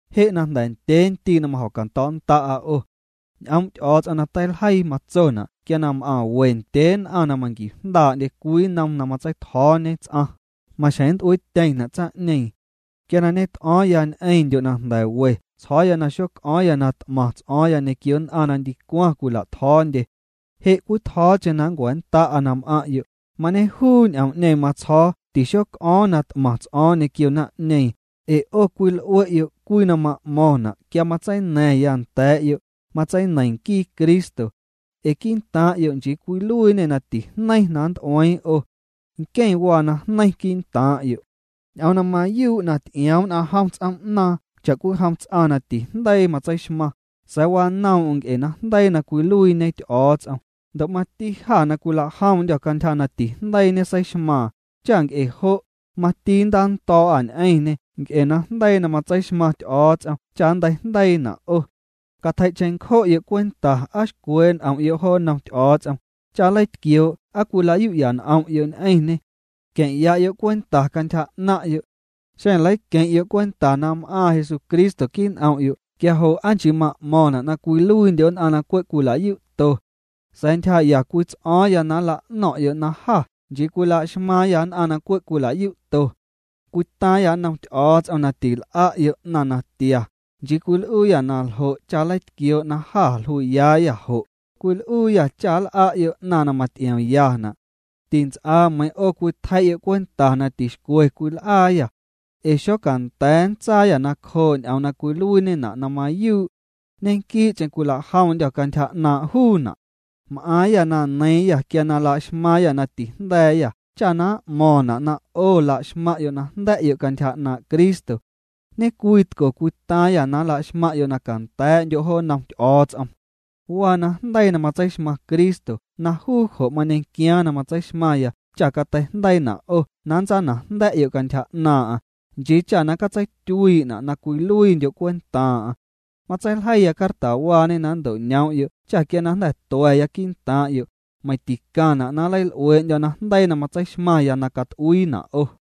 Je' jnda̱ ndyee ndii' na majo̱cando̱o̱'a 'o. Ñ'oom' Ty'o̱o̱ts'om na teiljeii matsona' quia na m'aⁿ we ndyee nn'aⁿ na manquiujndaa'ndye cwii nnom na matsei'tjo̱o̱ñe ts'aⁿ, maxjeⁿ nnt'uiityeⁿna' tsaⁿ'ñeeⁿ. Quia na ñet'o̱o̱ⁿya ñ'eⁿndyo' na jnda̱ we tsjo̱o̱ya na xoc'o̱o̱ⁿya na t'maⁿ ts'o̱o̱ⁿya ñequio nn'aⁿ na ndicwaⁿ cwila'tjo̱o̱ndye. Je' cwitjo̱o̱cheⁿ na nncua̱nnda'a na m'aⁿ'yo', mañejuu ñ'oom'ñeeⁿ matsjo̱o̱ tixoc'o̱o̱ⁿ na t'maⁿ ts'o̱o̱ⁿ ñequio naⁿ'ñeeⁿ, ee 'o cwil'ue'yo' cwii na ma'mo̱ⁿna' quia matseina̱ⁿya nda̱a̱'yo', matseineiⁿ nquii Cristo. Ee quii'ntaaⁿ'yo' nchii cwiluiiñê na tijneiⁿ na nnt'ueiiⁿ 'o. Nqueⁿ waa najneiⁿ quii'ntaaⁿ'yo'. Ñ'oom na mayuu' na ty'ioom nn'aⁿ jom ts'oom'naaⁿ cha'cwijom ts'aⁿ na tijndeii matseixmaⁿ, sa̱a̱ wanoom'm nc'e najndeii na cwiluiiñe Ty'o̱o̱ts'om, ndo' mati jâ na cwilajomndyô̱ cantyja na tijndeii ñeseixmaaⁿ, cha nc'e jo', mati nntando̱o̱'â ñ'eⁿñê nc'e najndeii na matseixmaⁿ Ty'o̱o̱ts'om cha nnteijndeiina' 'o. Catjei' cheⁿncjo'yo' cwenta aa xcwee' n'om'yo' jo nnom Ty'o̱o̱ts'om, cha nleitquioo' ¿aa cwila'yu'ya n'om'yo' ñ'eⁿñê? Queⁿ'ya'yo' cwenta cantyja 'naaⁿ'yo'. Xeⁿ leiqueⁿ'yo' cwenta na m'aaⁿ Jesucristo quii' n'om'yo' quia jo' ¿aa chii ma'mo̱ⁿna' na cwiluiindyo' nn'aⁿ na cwe' cwila'yu'to? Sa̱a̱ ntyjaa'ya cwii ts'o̱o̱ⁿya na nla'no̱ⁿ'yo' na jâ nchii cwila'xmaaⁿyâ nn'aⁿ na cwe' cwila'yu'to. Cwitaaⁿyâ nnom Ty'o̱o̱ts'om na til'a'yo' 'naⁿ natia, nchii cwil'uuyâ naljo' cha nleitquioo' na jâ jlui'yaayâ jo', cwil'uuyâ cha nl'a'yo' 'naⁿ na maty'iomyana'. Tints'aa meiiⁿ 'o cwitjei'yo' cwenta na tixcwe cwil'aayâ. Ee xocanda̱a̱ nntsaayâ nacjoo' ñ'oom na cwiluiiñena' na mayuu'. Ñequii'cheⁿ cwilajomndyô̱ cantyja 'naaⁿ' juuna'. M'aaⁿyâ na neiiⁿyâ quia na laxmaaⁿyâ na tijnda̱a̱yâ cha na m'mo̱ⁿna' na 'o laxmaⁿ'yo' na jnda̱'yo' cantyja 'naaⁿ' Cristo. Ñecwitco cwitaaⁿyâ na nlaxmaⁿ'yo' na canda̱a̱'ndyo' jo nnom Ty'o̱o̱ts'om. Waa najndeii na matseixmaⁿ Cristo na juu jo' mañequiaaⁿ na matseixmaⁿya cha cateijndeiina' 'o na nntsanajnda̱'yo' cantyja 'naaⁿ'aⁿ, nchii cha na catseityuii'na' na cwiluiindyo' cwentaaⁿ'aⁿ. Matseiljeiya cartawaañe na nnto'ñoom'yo' cha quia na jnda̱ tua̱ya quii'ntaaⁿ'yo', meiⁿ ticaⁿna' na nleil'uee'ndyo̱ najndeii na matseixmaⁿya na cat'uiina' 'o.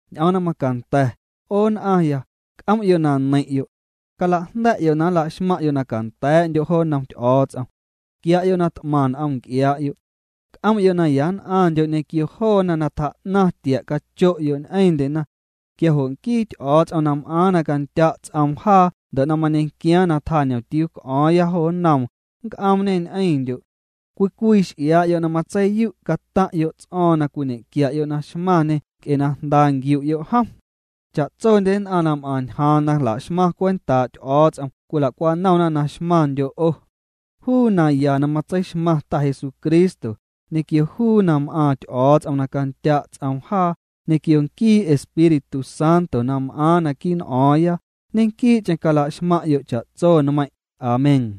Ñ'oom na macanda̱, 'o nn'aⁿya, c'om'yo' na neiⁿ'yo'. Calajnda̱'yo' na nla'xmaⁿ'yo' na canda̱a̱'ndyo' jo nnom Ty'o̱o̱ts'om. Quia'yo' na t'maⁿ n'om nc'iaa'yo'. C'om'yo' na ya nn'aⁿndyo' ñequio joona na tjaa'naⁿ tia' cacho'yo' ñ'eⁿndyena. Quia jo' nquii Ty'o̱o̱ts'om na m'aaⁿ na candya' ts'oom jaa ndo' na mañequiaaⁿ na tjaa ñomtiuu c'o̱o̱ⁿya jo nnoom, nnc'oomñê ñ'eⁿndyo'. Cwii cwii x'iaa'yo' na matseiyu' cataⁿ'yo' ts'o̱o̱ⁿ na cwiñequia'yo' na xmaⁿñê nc'e na jnda nquiu'yo' jom. Cha'tsondye nn'aⁿ na m'aⁿ ñjaaⁿ na la'xmaⁿ cwentaa' Ty'o̱o̱ts'om cwila'cwanomna na xmaⁿndyo' 'o. Juu naya na matseixmaⁿ Ta Jesucristo, ñequio juu na m'aaⁿ Ty'o̱o̱ts'om na candya' ts'oom jaa, ñequio nquii Espíritu Santo na m'aaⁿ naquii' n'o̱o̱ⁿya, ñequii'cheⁿ cala'xmaⁿ'yo' cha'tso nmeiⁿ'. Amén.